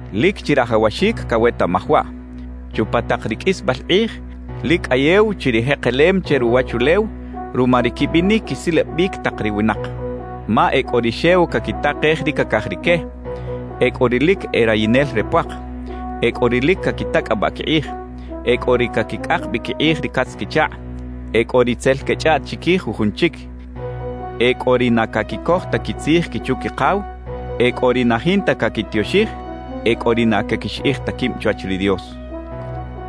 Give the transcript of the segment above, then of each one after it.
Lic chirajawaxic cawetaꞌmaj waꞌ: Chupa tak ri qꞌuisbal kꞌij lic cꞌayew chi ri jekelem che ruwachulew ruma ri quibinic quisilabic tak ri winak. Ma e cꞌo ri xew caquitakej ri cacaj rique, e cꞌo ri lic e rayinel re puak, e cꞌo ri lic caquitacꞌabaꞌ quikꞌij, e cꞌo ri caquicꞌak bi quikꞌij ri catz-quichakꞌ, e cꞌo ri tzel quechꞌaꞌt chiquij jujun chic, e cꞌo ri na caquicoj ta quitzij quichu-quikaw, e cꞌo ri na jinta caquitioxij, e cꞌo ri na caquixiꞌij ta quib chwach ri Dios.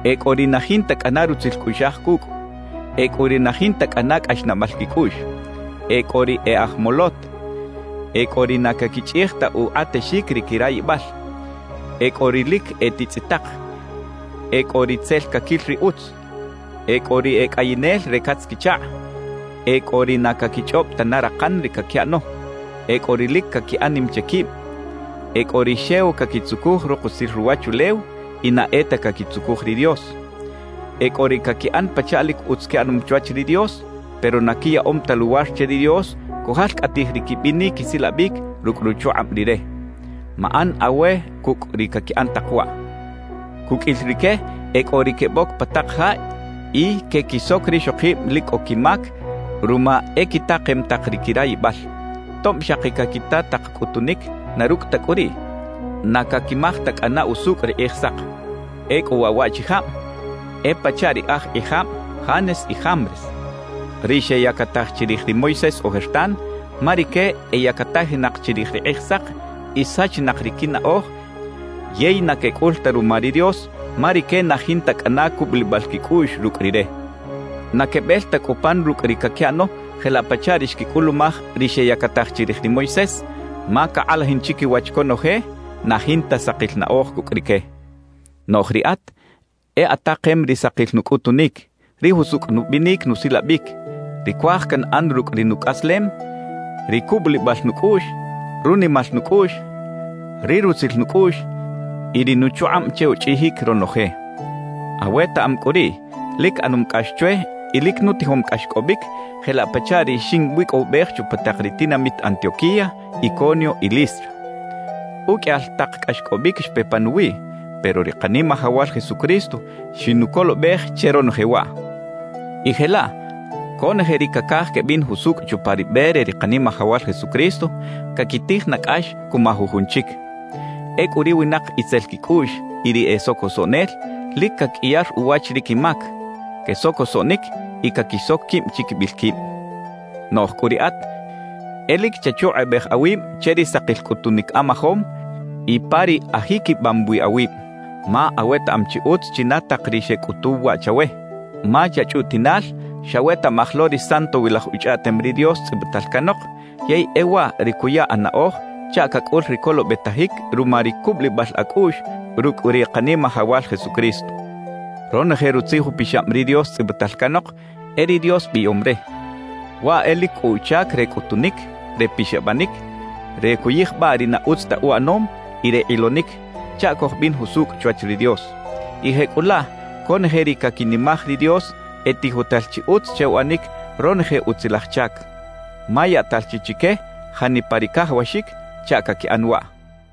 E cꞌo ri na jinta cꞌana rutzil cꞌuꞌxaj cucꞌ, e cꞌo ri na jinta cꞌana cꞌaxnaꞌbal quicꞌuꞌx, e cꞌo ri e aj molot, e cꞌo ri na caquichꞌij ta ukꞌatexic ri quirayibal, e cꞌo ri lic e titzꞌitak, e cꞌo ri tzel caquil ri utz. E cꞌo ri e cꞌayinel re catz-quichakꞌ, e cꞌo ri na caquichꞌob tana rakan ri caquiꞌano, e cꞌo ri lic caquiꞌan nim che quib, e cꞌo ri xew caquitzucuj rukusil ruwachulew y na e ta caquitzucuj ri Dios. E cꞌo ri caquiꞌan pachaꞌ lic utz quiꞌanom chwach ri Dios pero na quiyaꞌom ta luwar che ri Dios cujalcꞌatij ri quibinic quisilabic rucꞌ ruchukꞌab Rire. Maꞌan awe cucꞌ ri caquiꞌan tak waꞌ. Cuqꞌuil rique e cꞌo ri queboc pa tak ja y quequisoc rixokib lic cꞌo quimac ruma e quitakem tak ri quirayibal. Tob xaki caquita tak cꞌutunic, na rucꞌ ta cꞌu riꞌ, na caquimaj ta cꞌana usucꞌ ri Kꞌijsak. Ecꞌu waꞌ waꞌchijab e pachaꞌ ri aj kꞌijab Janes y Jambres, ri xeyacataj chirij ri Moisés ojertan, ma rique eyacatajinak chirij ri Kꞌijsak y sachinak ri quinaꞌoj yey na quecꞌul ta ruma ri Dios ma rique na jinta cꞌana cubulibal quicꞌuꞌx rucꞌ Rire. Na quebel ta cꞌu pan rucꞌ ri caquiꞌano jelaꞌ pachaꞌ ri xquicꞌulumaj ri xeyactaj chirij ri Moisés, ma cakꞌalajin chiquiwach conoje, na jinta sakil naꞌoj cucꞌ rique. Noꞌj riꞌat e atakem ri sakil nucꞌutunic, ri jusucꞌ nubinic nusilabic, ri cuaj canꞌan rucꞌ ri nucꞌaslem, ri cubulibal nucꞌuꞌx, runimal nucꞌuꞌx, ri rutzil nucꞌuꞌx y ri nuchukꞌab che uchꞌijic ronoje. Awetaꞌam cꞌu riꞌ lic ꞌanom cꞌax chwe y lic nutijom cꞌaxcꞌobic jelaꞌ pachaꞌ ri xinwicꞌowibej chupa tak ri tinamit Antioquía, Iconio y Listra. Uqꞌuiyal tak cꞌaxcꞌobic xpe panuwiꞌ, pero ri Kanimajawal Jesucristo xinucolobej che ronoje waꞌ. Y jelaꞌ conoje ri cacaj quebin jusucꞌ chupa ri be re ri Kanimajawal Jesucristo, caquitij na cꞌax cuma jujun chic. Ecꞌu ri winak itzel quicꞌuꞌx y ri e socosoꞌnel, lic caqꞌuiyar uwach ri quimac. Quesocosoꞌnic y caquisoc quib chiquibil quib. Noꞌj cꞌu riꞌat e lic chachukꞌubej awib che ri sakil cꞌutunic amajom y pa ri ajiquibam wi awib. Ma awetaꞌam chi utz china tak ri xecꞌutuw waꞌ chawe. Ma chachꞌutiꞌnal xawetaꞌmaj lo ri Santowilaj Uchꞌaꞌtem ri Dios tzꞌibital canok, yey e waꞌ ri cuya anaꞌoj chaꞌ cacꞌul ri colobetajic ruma ri cubulibal acꞌuꞌx rucꞌ ri Kanimajawal Jesucristo. Ronoje Rutzij Upixab ri Dios tzꞌibital canok e ri Dios biꞌyom re; waꞌ e lic cꞌo uchac re cꞌutunic, re pixabanic, re cuyijbaꞌ ri na utz ta uꞌanom y re kꞌilonic chaꞌ cojbin jusucꞌ chwach ri Dios; y jecꞌulaꞌ conoje ri caquinimaj ri Dios e tijotal chi utz che uꞌanic ronoje utzilaj chac, ma yaꞌtal chi chique janipa ri cajawaxic chaꞌ caquiꞌan waꞌ.